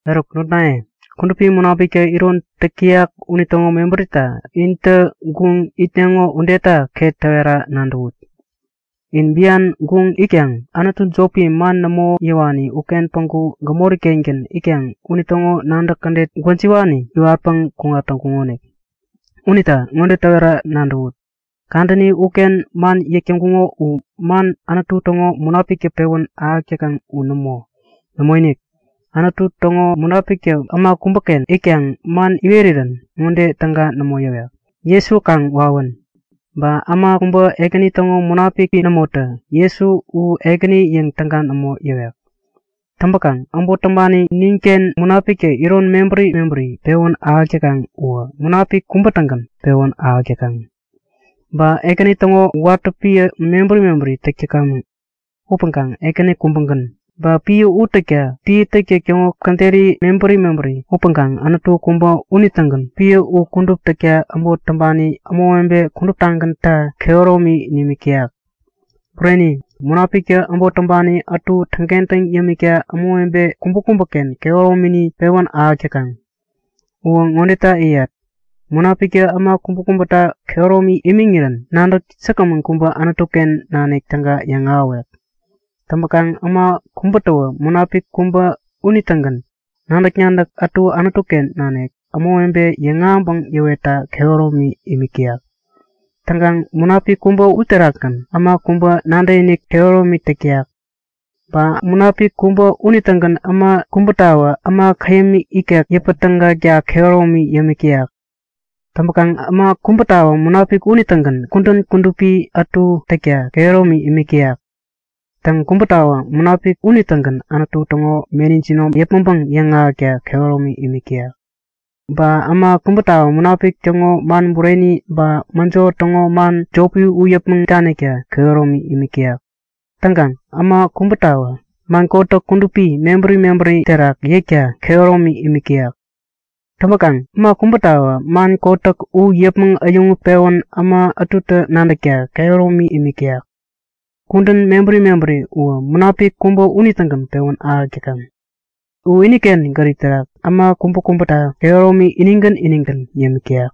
Eruk notnaye, Kudupi Munapiktä iron täk täyak unitäŋo mebärita intä guŋ itneŋo udeta ŋode täwera ket nadäwut; In bian guŋ itkaŋ anutu jopi, man nämo yäwani uken päŋku gämori-kengän itkaŋ unitäŋo nadäk kädet gwäjiwani iwatpäŋ kuŋat täŋkuŋonik. Unita ŋode täwera nadäwut; Kadäni uken man yäk täŋkuŋo u man Anutu täŋo Munapiktä pewän ahäk täkaŋ u nämo. Nämoinik! Anutu täŋo Munapiktä äma kubäken itkaŋ man iwerirän ŋode täga nämo yäwek; Jesu kaŋ wawän! Ba äma kubä Ekäni täŋo Munapiki nämotä Jesu u Ekäni yäŋ täga nämo yäwek. Täŋpäkaŋ äbot täŋpani ninken Munapiktä iron mebäri mebäri pewän ahäk täkaŋ uwä Munapik kubä-tägän pewän ahäk täkaŋ. Ba Ekäni täŋo watä piä mebäri mebäri täk täkamäŋ upäŋkaŋ Ekäni kubägän. Ba piä u täkta piä täktäk täŋo käderi mebäri mebäri upäŋkaŋ Anutu kubä unitägän piä u kudup täkta äbot täŋpani ämawebe kuduptagänta kehäromi nimik täyak. Bureni, Munapiktä äbot täŋpani ätu täŋkentäŋ yämikta ämawebe kubäkubäken kehäromini pewän ahäk täkaŋ. Uwä ŋodeta yäyat; Munapiktä äma kubäta kehäromi imiŋirän nadäk säkgämän kubä Anutu-ken nanik täga yäŋahäwek. Täŋpäkaŋ äma kubätawä Munapik kubä unitägän nadäk-nadäk ätu Anutu-ken nanik ämawebe yäŋahäŋpäŋ yäwetta kehäromi imik täyak. Täŋkaŋ Munapik kubä uterakgän äma kubä nadäkinik kehäromi täk täyak. Ba Munapik kubä unitägän äma kubätawä äma käyäm ikek yäpän-tägakta kehäromi imik täyak. Täŋpäkaŋ äma kubätawä Munapik unitägän kudän kudupi ätu täkta kehäromi imik täyak. Täŋ, kubätawä Munapik unitägän Anutu täŋo meni jinom yäpmäŋpäŋ yäŋahäkta kehäromi imik täyak. Ba äma kubätawä Munapik täŋo man bureni ba mäjo täŋo man jopi u yäpmäŋ danikta kehäromi imik täyak. Täŋkaŋ äma kubätawä man kotäk kudupi mebäri mebäri terak yäkta kehäromi imik täyak. Täŋpäkaŋ äma kubätawä man kotäk u yäpmäŋ äyäŋutpewän äma ätutä nadäkta kehäromi imik täyak. Kudän mebäri mebäri uwä, Munapik kubä unitägän pewän ahäk täkaŋ. U iniken gärip terak äma kubäkubäta kehäromi inigän inigän yämik täyak.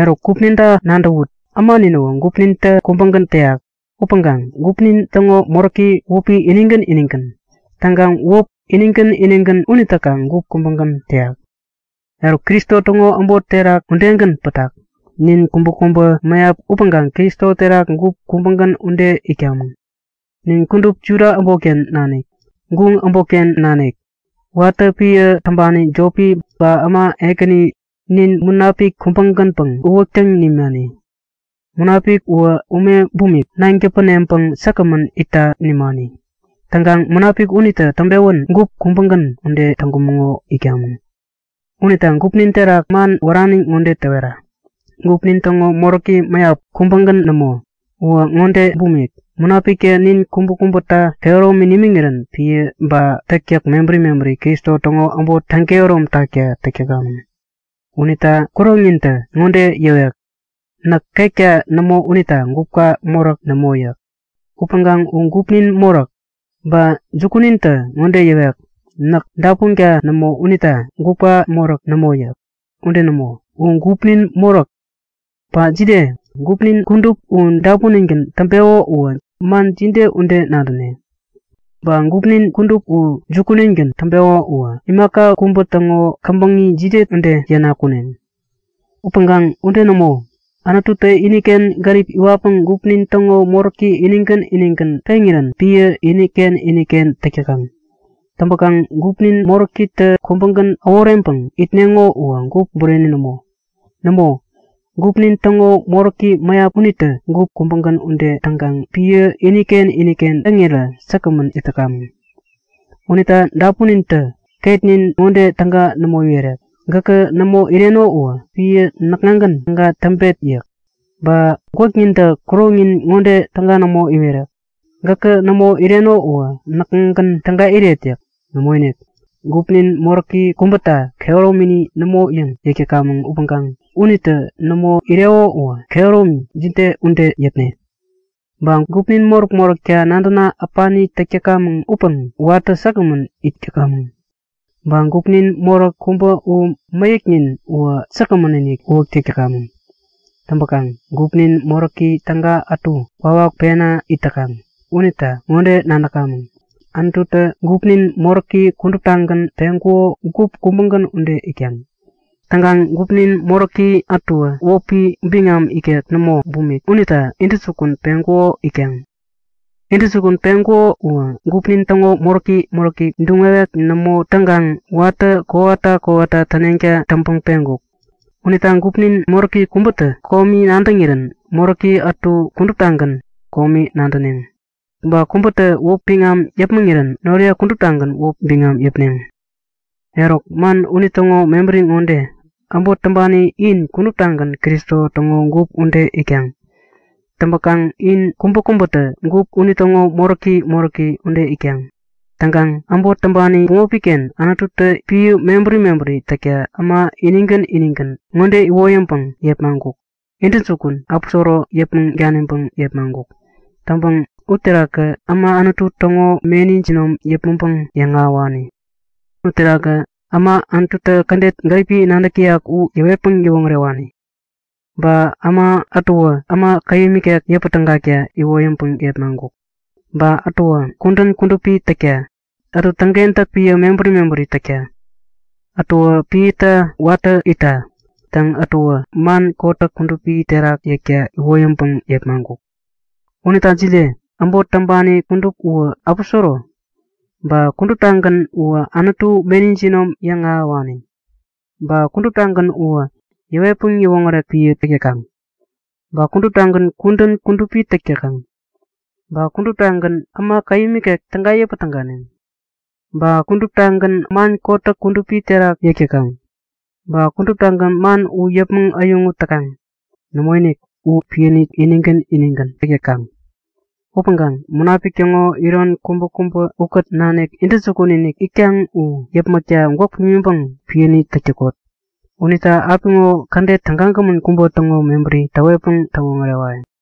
Eruk gupninta nadäwut. Äma ninäwä gupnintä kubägän täyak upäŋkaŋ gupnin täŋo moräki wäpi inigän inigän. Täŋkaŋ wäp inigän inigän unitäkaŋ gup kubägän täyak. Eruk Kristo täŋo äbot terak udegän pätak. Nin kubäkubä mäyap upäŋkaŋ Kristo terak gup kubägän ude itkamäŋ. Nin kudup, Juda äbotken nanik, guŋ äbotken nanik, watä piä täŋpani jopi ba äma ekäni, nin Munapik kubägänpäŋ uwäktäŋ nimani. Munapik uwä ume bumik, naŋ täpäneŋpäŋ säkgämän itta nimani. Täŋkaŋ Munapik unitä täŋpewän gup kubägän ude täŋkumäŋo itkamäŋ. Unita gupnin terak man wärani ŋode täwetat; Gupnin täŋo moräki mäyap, kubägän nämo. Uwä ŋode bumik; Munapiktä nin kubäkubäta kehäromi nimiŋirän piä ba täktäk mebäri mebäri Kristo täŋo äbot täŋkehärom takta täk täkamäŋ. Unita kuroŋnintä ŋode yäwek; Näk ketka nämo unita gupka moräk nämo yäk. Upäŋkaŋ u gupnin moräk! Ba jukunintä ŋode yäwek; Näk dapunka nämo unita gupka moräk nämo yäk. Ude nämo! U gupnin moräk! Ba jide? Gupnin kudup u dapuningän täŋpeko uwä man jide ude nadäne? Ba gupnin kudup u jukuningän täŋpeko uwä imaka kubä täŋo käbäŋi jide ude yäna-kuneŋ? Upäŋkaŋ ude nämo, Anututä iniken gärip iwatpäŋ gupnin täŋo moräki inigän inigän peŋirän piä iniken iniken täk täkaŋ. Täŋpäkaŋ gupnin moräkitä kubägän äworeŋpäŋ itneŋo uwä gup bureni nämo! Nämo, gupnin täŋo moräki mäyap unitä gup kubägän ude täŋkaŋ piä iniken iniken täŋirä säkgämän it täkamäŋ. Unita dapunintä ketnin ŋode täga nämo iwerek; Gäkä nämo ireno uwä piä näkŋagän täga täŋpet! yäk. Ba gwäknintä kuroŋnin ŋode täga nämo iwerek; Gäkä nämo ireno uwä näkŋagän täga iret! yäk. Nämoinik, gupnin moräki kubäta kehäromini nämo yäŋ yäk täkamäŋ upäŋkaŋ unitä nämo ireko uwä kehäromi jide ude yäpne? Ba gupnin moräk-moräkta nadäna äpani täk täkamäŋ upäŋ watä säkgämän it yämik täkamäŋ. Ba gupnin moräk kubä u mäyäknin uwä säkgämän-inik uwäk täk täkamäŋ. Täŋpäkaŋ gupnin moräki täga ätu kwawak pena it täkaŋ unita ŋode nadäkamäŋ; Anututä gupnin moräki kuduptagän peŋkuko gup kubägän ude itkaŋ. Täŋkaŋ gupnin moräki ätuwä wäpi biŋam ikek nämo bumik unita intäjukun peŋkuko itkaŋ. Intäjukun peŋkuko uwä gupnin täŋo moräki moräki duŋ-wewek nämo täŋkaŋ watä kowata kowata täneŋta täŋpäŋ peŋkuk. Unita gupnin moräki kubätä komi nadäŋirän moräki ätu kuduptagän komi nadäneŋ. Ba kubätä wäp biŋam yäpmäŋirän noriye kuduptagän wäpi biŋam yäpneŋ. Eruk, man unitäŋo mebäri ŋode; Äbot täŋpani in kuduptagän Kristo täŋo gup ude itkaŋ. Täŋpäkaŋ in kubäkubätä gup unitäŋo moräki moräki ude itkaŋ. Täŋkaŋ äbot täŋpani bämopi-ken Anututä piä mebäri mebäri täkta äma inigän inigän ŋode iwoyäŋpäŋ yepmaŋkuk; Intäjukun, aposoro yäpmäŋ daniŋpäŋ yepmaŋkuk. Täŋpäŋ uterakä äma Anutu täŋo meni jinom yäpmäŋpäŋ yäŋahäwani. Uterakä äma Anututä kädet gäripi nadäk täyak u yäwetpäŋ yäwoŋärewani. Ba äma ätuwä äma käyäm ikek yäpätägakta iwoyäŋpäŋ yepmaŋkuk. Ba ätuwä kudän kudupi täkta, ätuwä täŋkentäk piä mebäri mebäri täkta, ätuwä piäta watä itta. Täŋ, ätuwä man kotäk kudupi terak yäkta iwoyäŋpäŋ yepmaŋkuk. Unita jide? Äbot täŋpani kudup uwä aposoro? Ba kuduptagän uwä Anutu meni jinom yäŋ ahäwani? Ba kuduptagän uwä yäwetpäŋ yäwoŋärek piä täk täkaŋ? Ba kuduptagän kudän kudupi täk täkaŋ? Ba kuduptagän äma käyäm ikek täga yäpä-täganeŋ? Ba kuduptagän man kotäk kudupi terak yäk täkaŋ? Ba kuduptagän man u yäpmäŋ äyäŋut täkaŋ? Nämoinik! U piäni inigän inigän täk täkaŋ. Upäŋkaŋ Munapik täŋo iron kubäkubä ukät nanik intäjukun-inik itkaŋ u yäpmäkta gwäk pimiŋpäŋ piäni täk täkot. Unita apiŋo kädet tägagämän kubä täŋo mebäri täwetpäŋ täwoŋärewayäŋ.